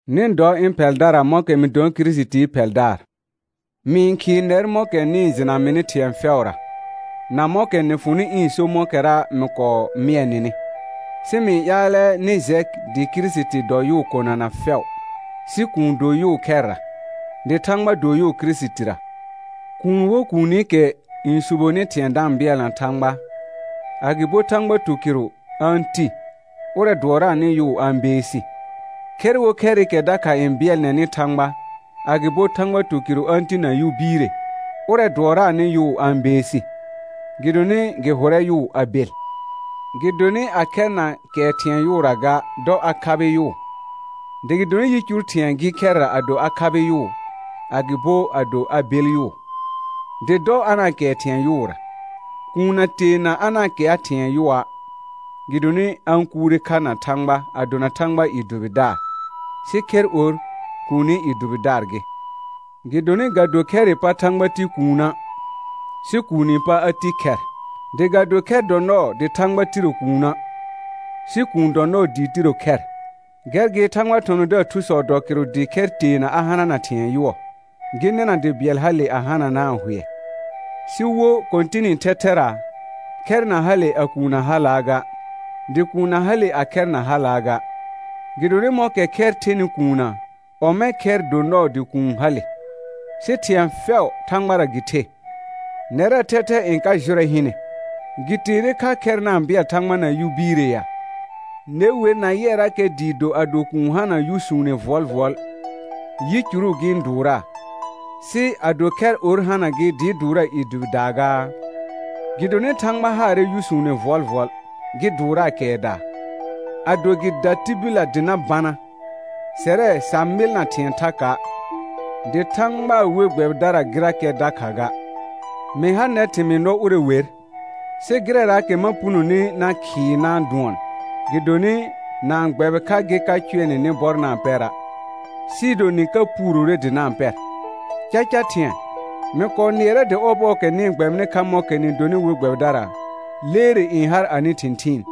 Nɩ dɔ ɩ̃ phɛldara mɔ̃kɛ mɩ donɩ Kirisitii phɛldaar. Mɩ-n khɩɩ nɛr mɔ̃kɛ nɩ-n jɩna mɩnɩ thɩ̃ɛ fɛʋra, na mɔ̃kɛ nɩ fʋnɩ ɩ̃ so mɔ̃kɛra mɩ kɔɔ mɩɛ nɩnɩ. Sɩ mɩ-n ƴaalɛ nɩ jɛ dɩ Kirisiti dɔ yʋʋ konana fɛʋ, sɩ kuun do yʋʋ khɛrra, dɩ Thãgba do yʋʋ Kirisitira. Kuun wo kuunikɛ n suboni thɩ̃ɛ da-n bɩɛlna Thãgba, agɩbo Thãgba tukɩrʋ a-n ti, ʋrɛ dʋɔraanɩ yʋʋ a-n beesi. Khɛr wo khɛrɩkɛ dakha n bɩɛlnɛnɩ Thãgba, agɩbo Thãgba tukɩrʋ a-n ti na yʋ biire, ʋrɛ dʋɔraanɩ yʋʋ a-n beesi, gɩdonɩ gɩ hʋrɛ yʋʋ a bel. Gɩdonɩ a khɛr na kɛɛ thɩ̃ɛ yʋʋra ga, dɔ a khabɩ yʋʋ; dɩ gɩdonɩ yicur thɩ̃ɛ gɩ khɛrra ado a khabɩ yʋʋ, agɩbo ado a bel yʋʋ, dɩ dɔ a na-n kɛɛ thɩ̃ɛ yʋʋra. Kuun na teana a na-n kɛa thɩ̃ɛ yʋɔa', gɩdonɩ a-n kuure kha na Thãgba a dona Thãgbaa i dʋbɩdaar, sɩ khɛr or, kuuni i dʋbɩdaar gɩ. Gɩdonɩ ga do khɛrɩ pa Thãgba ti kuuna', sɩ kuuni pa a ti khɛr. Dɩ ga do khɛr dɔ nɔɔ dɩ Thãgba tiro kuuna', sɩ kuun dɔ nɔɔ dɩ tiro khɛr. Gɛr gɩ Thãgbaa thɔ̃thɔ̃daar thusɔ dɔ kɩrʋ dɩ khɛr teena a hanana thɩ̃ɛ yʋɔ, gɩ nɩna dɩ bɩɛl hale a hananaa hʋɛ. Sɩ wo Kɔ̃tɩnɩ thɛthɛra, khɛr na hale a kuun na halaa ga, dɩ kuun na hale a khɛr na halaa ga. Gɩdonɩ mɔ̃kɛ khɛr thenɩ kuunna, ɔmɛ̃ khɛr do nɔɔ dɩ kuun hale, sɩ thɩ̃ɛ fɛʋ Thãgbara gɩ the. Nɛrɛɛ thɛthɛ n ka jʋrɛ hɩnɛ, gɩ teere kha khɛr na-n bɩɛl Thãgba na yʋ biire ya? Ne wer na yɩɛrakɛ dɩɩ do ado kuun hana yʋsuune vʋɔlvʋɔl, yicuru gɩ-n dʋʋraa; sɩ ado khɛr or hana gɩ dɩɩ dʋʋraa i dʋbɩdaa gaa? Gɩdonɩ Thãgba haarɛ yʋsuune vʋɔlvʋɔl gɩ dʋɔraa kɛɛdaa. Ado gɩ da tibillə dɩ na bana, sɛrɛ sa mɩlna thɩ̃ɛ thaka', dɩ Thãgbaa we gbɛbɩdara gɩrakɛ dakha ga. Mɩ ha nɛr thɩmɩɩ nɔ ʋrɛ wer, sɩ gɩrɛraakɛ ma punoni na khɩɩ na' dʋɔn gɩdonɩ, na-n gbɛbɩ kha gɩ ka cʋɛ nɩ nɩ bɔr na-n pɛra', sɩɩ do nɩ ka puurore dɩ na-n pɛr. Caca thɩ̃ɛ, mɩ kɔɔ nɩɛrɛ dɩ ɔbɔɔkɛ nɩ-n gbɛbɩnɩ kha mɔ̃kɛ nɩ donɩ we gbɛbɩdara, leere n har anɩ thɩ̃thɩɩn,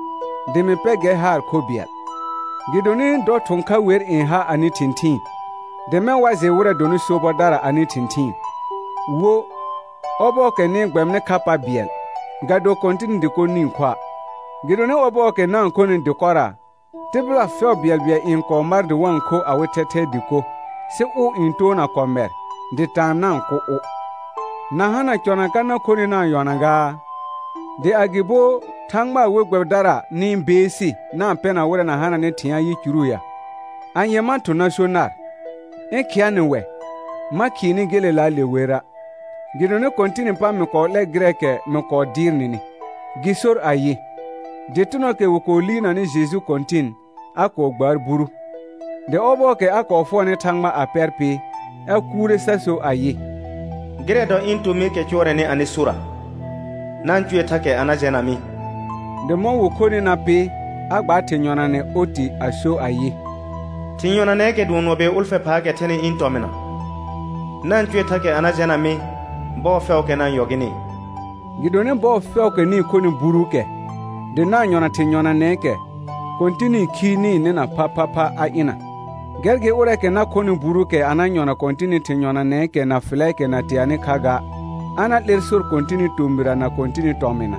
dɩ mɩ pɛ gɛr haar kho bɩɛl. Gɩdonɩ dɔ thʋ̃ kha wer n ha anɩ thɩ̃thɩɩn, dɩ mɛ̃ wa jɩ wɩrɛ dɔnɩ sobɔdara anɩ thɩ̃thɩɩn. Wo, ɔbɔɔkɛ nɩ-n gbɛbɩnɩ kha pa bɩɛl, ga do Kɔ̃tɩnɩ dɩko nɩ-n khoa'. Gɩdonɩ ɔbɔɔkɛ na-n khonɩ dɩkɔra, tɩbɩla fɛʋ bɩɛlbɩɛl n kɔɔ mar dɩ wa-n kho awɩ thɛthɛɛ dɩko, sɩ ʋ n toona kɔmɛr, dɩ taan na-n kʋ ʋ. Na hana cɔna ka na khonɩ na-n yɔna gaa? Dɩ agɩbo Thãgbaa we gbɛbɩdara nɩ-n beesi na-n pɛna wɩrɛ na hananɩ thɩ̃a' yicuru ya? Anye ma thʋ̃ na so nar? Ɩ̃ khɩa nɩ wɛ? Ma khɩɩ nɩ gelelaale wera'. Gɩdonɩ Kɔ̃tɩnɩ pa mɩ kɔɔ 'lɛ gɩrɛɛkɛ mɩ kɔɔ dɩɩr nɩnɩ, gɩ sor ayɩ: Dɩtɩnɔɔkɛ wɩ kɔɔ liirnanɩ Jeju Kɔ̃tɩn, a kɔɔ gbaar buru, dɩ ɔbɔɔkɛ a kɔɔ fʋɔrnɩ Thãgba a pɛr pɩ, a kuure sa so ayɩ: «Gɩrɛ dɔ ɩ̃ tomɩɩkɛ cʋɔrɛnɩ anɩ sora; na-n cʋɛ thakɛ a na jɛna mɩ.» Dɩ mɔ̃ wɩ khonɩ na pɩ, a gbaar thɩ̃ yɔnanɛ oti a so ayɩ: «Thɩ̃ yɔnanɛɛkɛ dʋɔn nɔ bɩɛl ʋlfɛ phaakɛ thɛnɩ ɩ̃ tɔmɩna; na-n cʋɛ thakɛ a na jɛna mɩ bɔɔ fɛʋʋkɛ na-n yɔ gɩnɩ.» Gɩdonɩ bɔɔ fɛʋʋkɛ nɩ-n khonɩ buruukɛ, dɩ na-n yɔna thɩ̃ yɔnanɛɛkɛ, Kɔ̃tɩnɩ khi nɩ-n nɩna phaphapha a ɩna. Gɛr gɩ ʋrɛɛkɛ na khɔnɩ buruukɛ a na yɔna Kɔ̃tɩnɩ thɩ̃ yɔnaakɛ na fɩlɛɛkɛ na teanɩ kha ga, a na 'lɛr sor Kɔ̃tɩnɩ tomɩra na Kɔ̃tɩnɩ tɔmɩna.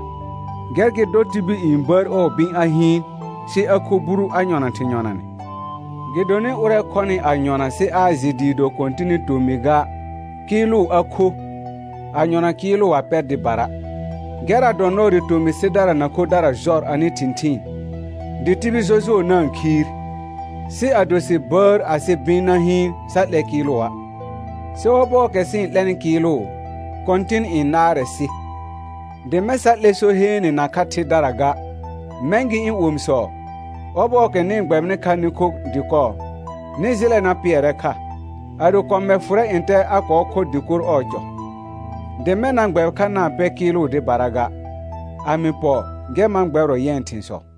Gɛr gɩ dɔ tibil n bəər ɔɔ bɩ̃ a hɩɩn, sɩ a kho buru a yɔna thɩ̃ yɔnanɛ. Gɩdonɩ ʋrɛɛkɛ khɔnɩ a yɔna sɩ aa jɩ dɩɩ do Kɔ̃tɩnɩ tomɩ ga, kɩɩlʋ a kho, a yɔna kɩɩlʋ a pɛr dɩbara. Gɛrra dɔ nɔɔ dɩ tomɩ sɩdara na khodara jɔr anɩ thɩ̃thɩɩn, dɩ tibil jɔjʋɔ na-n khiir. Sɩ ado sɩ bəər asɩ bɩ̃ na hɩɩn, sa 'lɛ kɩɩlʋa'. Sɩ ɔbɔɔkɛ sɩ-n 'lɛnɩ kɩɩlʋ, Kɔ̃tɩn n naarɛ sɩ, dɩ mɛ̃ sa 'lɛ so heene nakha thɩdara ga. Mɛ̃ gɩ ɩ̃ omisɔ, ɔbɔɔkɛ nɩ-n gbɛbɩnɩ kha nɩ kho dɩkɔ, nɩ jɩlɛ na pɩɛrɛ kha. Ado kɔmɛr fʋrɛ ntɛ a kɔɔ khɔ dɩkor ɔɔ cɔ, dɩ mɛ̃ na gbɛbɩ kha na-n pɛ kɩɩlʋ dɩbara ga. A mɩ pɔ, gɛr ma gbɛbɩrɔ yɛ̃ thɩ̃sɔ.